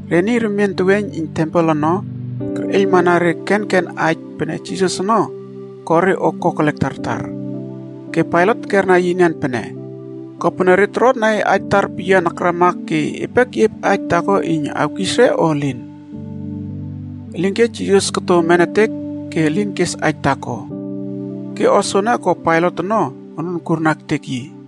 Re niy remien teweiyn iyn tempel ono kerꞌeiylmana re kenken aij pene Jisas ono ko re o kokelek tartar. Ke Pailat tekerna yi enian pene, “Kopene re torotna e aij tartar peyian akrama ke epe keꞌiep aij taako iyn awkis o elin?” Elinke Jisas koto nemetek ke elin kes aij taako. Ke o soene ko Pailat ono onun kurna ektek yi.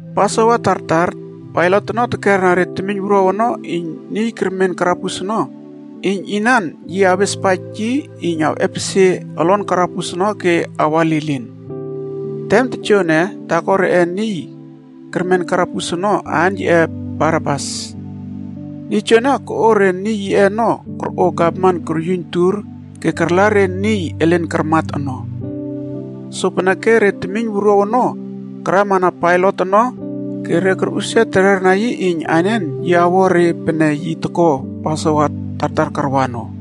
Pasova tartar Pailat ono tekera re temiynwuruaw ono iyn niy kermen karabus ono iyn inan yi awespaij yi iyn awꞌepesie olon karabus ono ke awa lilin. Tem tojoene, taako reꞌe niy kermen karabus ono, aan yiꞌe Barabas. Niy joene koꞌo re niy yiꞌe ono korꞌo gavman koryuiyn tur ke karla re niy elen karmat ono. Sopeneke re temiyn wuruaw ono karamana Pailat ono ke re korꞌusia tererna yi iyn anen yi awo re pene yi toko Pasova tartar karwa ono.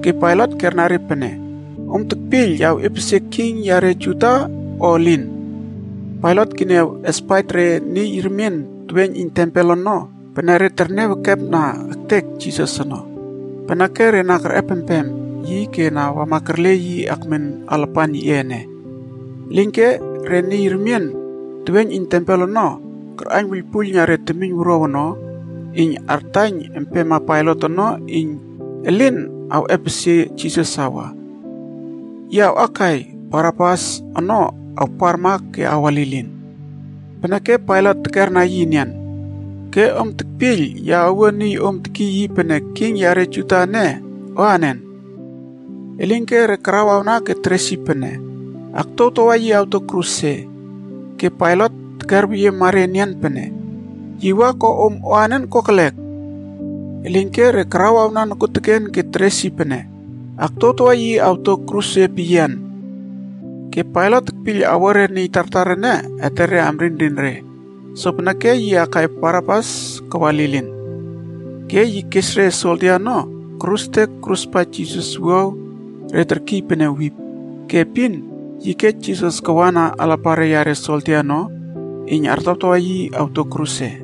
Ke Pailat kerna re pene, “Om tekpiyl ya awꞌepesie king yare Juda, o elin?” Pailat keniaw espaij re niy remien teweiyn iyn tempel ono pene re terniaw ekepna ektek Jisas ono. Peneke re na kerꞌepempem yi ke na wama kerle yi akmen alapan yiꞌe ene. Elinke re niy remien teweiyn iyn tempel ono karꞌaiyn wuiylpuiylna re temiyn wuruaw ono iyn artaiyn empema Pailat ono iyn elin awꞌepesie Jisas awa. Yi awꞌakai Barabas ono awparma ke awa lilin. Peneke Pailat tekerna re enian, “Ke om tekpiyl ya awo niy om tekiy yi pene ‘king yare Juda’ ene, anen?” Elinke Re karawawna ke teres yi pene, “Aktuawtawa yi awto kruse!” Ke Pailat terkerweyiema re enian pene, “Yi wa ko om anen kokelek?” Elinke re karawawna nokuoteken ke teres yi pene, “Aktuawtawa yi awto kruse peyian!” Ke Pailat tekpiyl awo re niy tartar ene etere amrinrin re, sopeneke yi akai Barabas kawa lilin. Ke yi kes re soldia ono korustek koruspaij Jisas wuaw re terkiy pene wip.a Ke epin yi kej Jisas kawana alapare yare soldia ono iyn artawtawa yi awto kruse.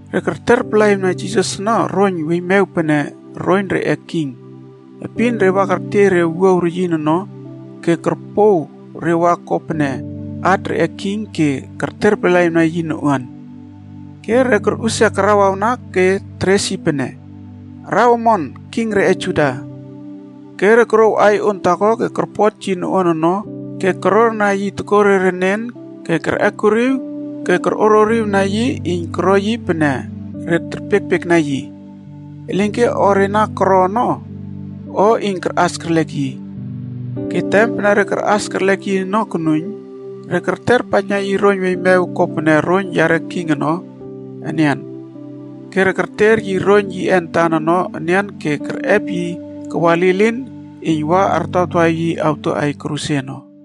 Re kerterpalaꞌiwna Jisas ono roiyn weiymew pene roiyn reꞌe king. Epin re wa kertiey re wuaw reyin ono ke korpow re wa ko pene hat reꞌe king ke kerterpalaꞌiwna yi noꞌuan. Ke re korꞌusia karawawna ke teres yi pene, “Araw omon, king reꞌe Juda!” Ke re korouw aiy on taako ke korpot yi noꞌuan ono ke kororna yi tokore renen ke kerꞌekuriw ke korꞌoririw na yi iyn koro yi pene re terpiekpiekna yi. Elinke o re na koro ono o iyn karꞌas kerlek yi. Ke tem pene re karꞌas kerlek yi ono konuiyn, re kerterpaijna yi roiyn weiymew kopene roiyn yare king ono enian. Ke re kerter yi roiyn yiꞌe antan ono enian ke kerꞌep yi kawa lilin iyn wa artawtawa yi awto kruse ono.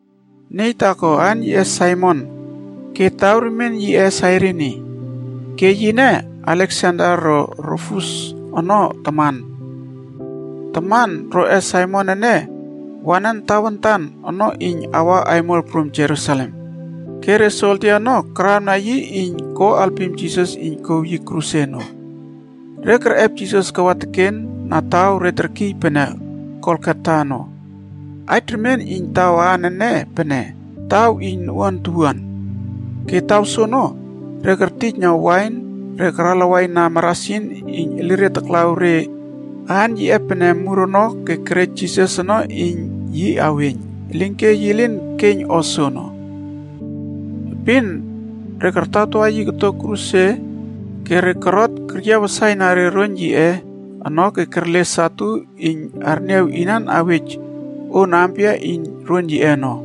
Niy taako aan yiꞌe Saimon ke taw remien yiꞌe Sairini. Ke yine, Aleksander ro Rufus ono taman. Taman roꞌe Saimon ene, wanan tawantan ono iyn awa aimol prum Jerusalem. Ke re soldia ono karawna yi iyn ko alpim Jisas iyn kouw yi kruse ono. Re kerꞌep Jisas kawa teken na taw re terkiy pene Golgota ono. Aij remien iyn taw aan ene pene, “taw iyn noꞌuan towuan.” Ke taw soono, re kertijna wain re karalawaina marasin iyn elire taklaw re aan yiꞌe pene “mur” ono ke kerej Jisas ono iyn yi aweiyn. Elinke yi lin keiyn o soono. Epin re kartawtawa yi koto kruse re korot keryiaw wasaina roiyn yiꞌe ono ke kerle satu iyn arniaw inan awej on ampia iyn roiyn yiꞌe ono.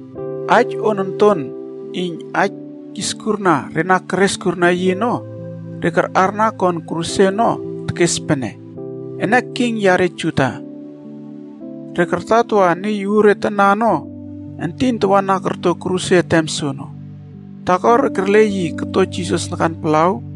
Aij on onton iyn aij kiskurna re na keres kurna yi ono, re karꞌarna kon kruse ono tekes pene: “ENE KING YARE JUDA.” Re kartawtawa niy uuretana ono, entin tawana korto kruse tem soono. Taako re kerle yi koto Jisas nakan palaw,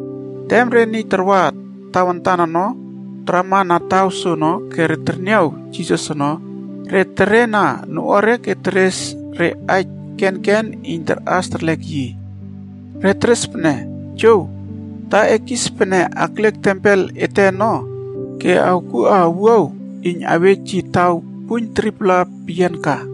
Tem re niy tarwa tawantan ono tarama na taw soono ke re terniaw Jisas ono, re terena noꞌuare ke teres re aij kenken iyn tarꞌas terlek yi. Re teres pene, “Jow, ta e kis pene akliek tempel ete ono ke awkuꞌa owuaw iyn awej yi taw puiyn 3-pla peyian ka!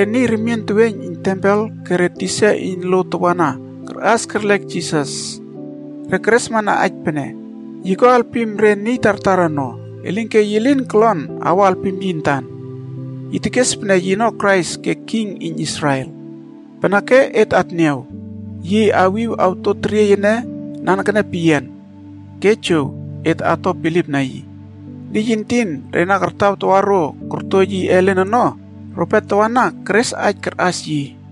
Re niy remien teweiyn iyn tempel ke re tisa iyn lo tawana karꞌas kerlek Jisas. Re keresmana aij pene, “Yi ko alpim re niy tartar ono, elinke yi lin kolon awo alpim yintan! Yi tekes pene yino Krais ke king iyn Israel. Peneke et atniaw yi awꞌepsie kruse ono ke awiw oto teriey ene nanekene peyian, ke jow, et ato bilipna yi.” Niy entin re kartawtawa ro korto yi elen ono, rope tawana keres aij karꞌas yi.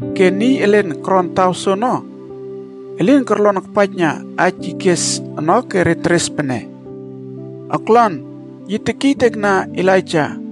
Ke niy elen koron taw soono, elin korlon akpaijna aij yi kes ono ke re teres pene, “Oklon, yi tekiytekna Elaija.”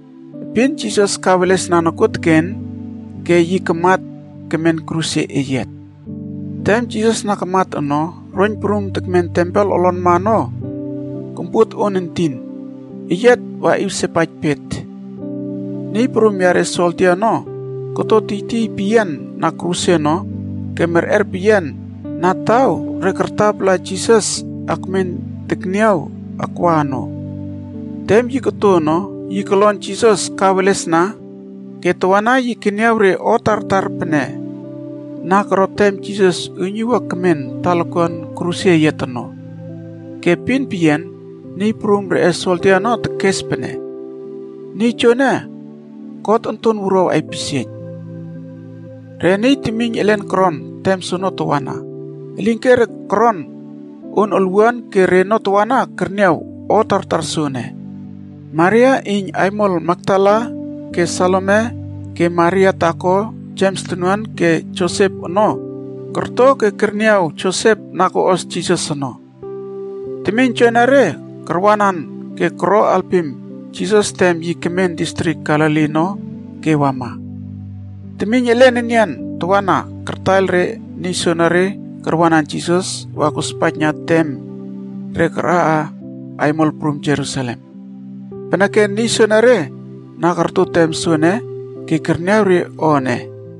Epin Jisas kawelesna nokuoteken ke yi kamat kemen kruse eyiat. Tem Jisas na kamat ono, roiyn prum tekmen tempel olonma ono kompuot on entin, eyiat waꞌiw sepaij pet. Niy prum yare soldia ono koto tiytiy peyian na kruse ono ke merꞌer peyian na taw re kartapala Jisas akmen tekniaw akwa ono. Tem yi koto ono, yi kolon Jisas kawelesna ke tawana yi keniaw re o tartar pene na koro tem Jisas uiynuwua kemen talakuan kruse eyiat ono. Ke epin peyian niy prum reꞌe soldia ono tekes pene, “Niy joene, God Onton Wuruaw aipisieiyn.” Re niy temiyn elen koron tem soono tawana. Elinke re koron on olwuana ke reno tawana kerniaw o tartar soene. Maria iyn aimol Makdala ke Salome ke Maria taako Jems tonuan ke Josep ono korto ke keniaw Josep na koꞌos Jisas ono. Temiyn joenere karwanan ke koro halpim Jisas tem yi kemen distrik Galili ono ke wama. Temiyn elen enian tawana kartaiyl re niy soenere karwanan Jisas wa kospaijna tem re karaꞌa aimol prum Jerusalem. Peneke niy soenere na korto tem soene ke kerniaw re o ene.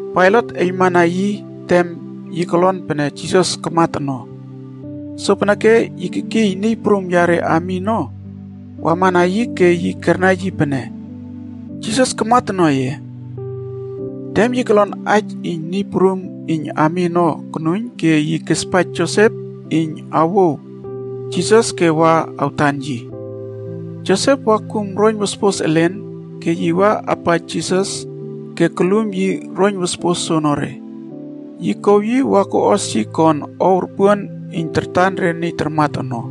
Pailat eiylmana yi tem yi kolon pene Jisas kamat ono. Sopeneke yi kekiy niy prum yare ami ono wamana yi ke yi kerna yi pene, “Jisas kamat ono ye?” Tem yi kolon aij iyn niy prum iyn ami ono konuiyn ke yi kespaij Josep iyn awouw Jisas ke wa awtan yi. Josep wa kum roiyn wospos elen ke yi wa apaij Jisas ke kolum yi roiyn wospos soonore. Yi kouw yi wa koꞌos yi kon ow ropuon iyn tartan re niy tarmat ono.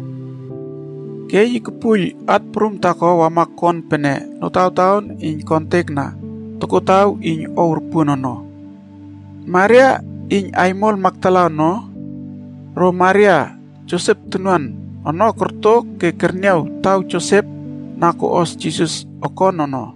Ke yi kopuoiyl at prum taako wama kon pene notawtaon iyn kontekna tokotaw iyn ow ropuon ono. Maria iyn aimol Makdala ono ro Maria Josep tonuan ono korto ke terniaw taw Josep na koꞌos Jisas okon ono.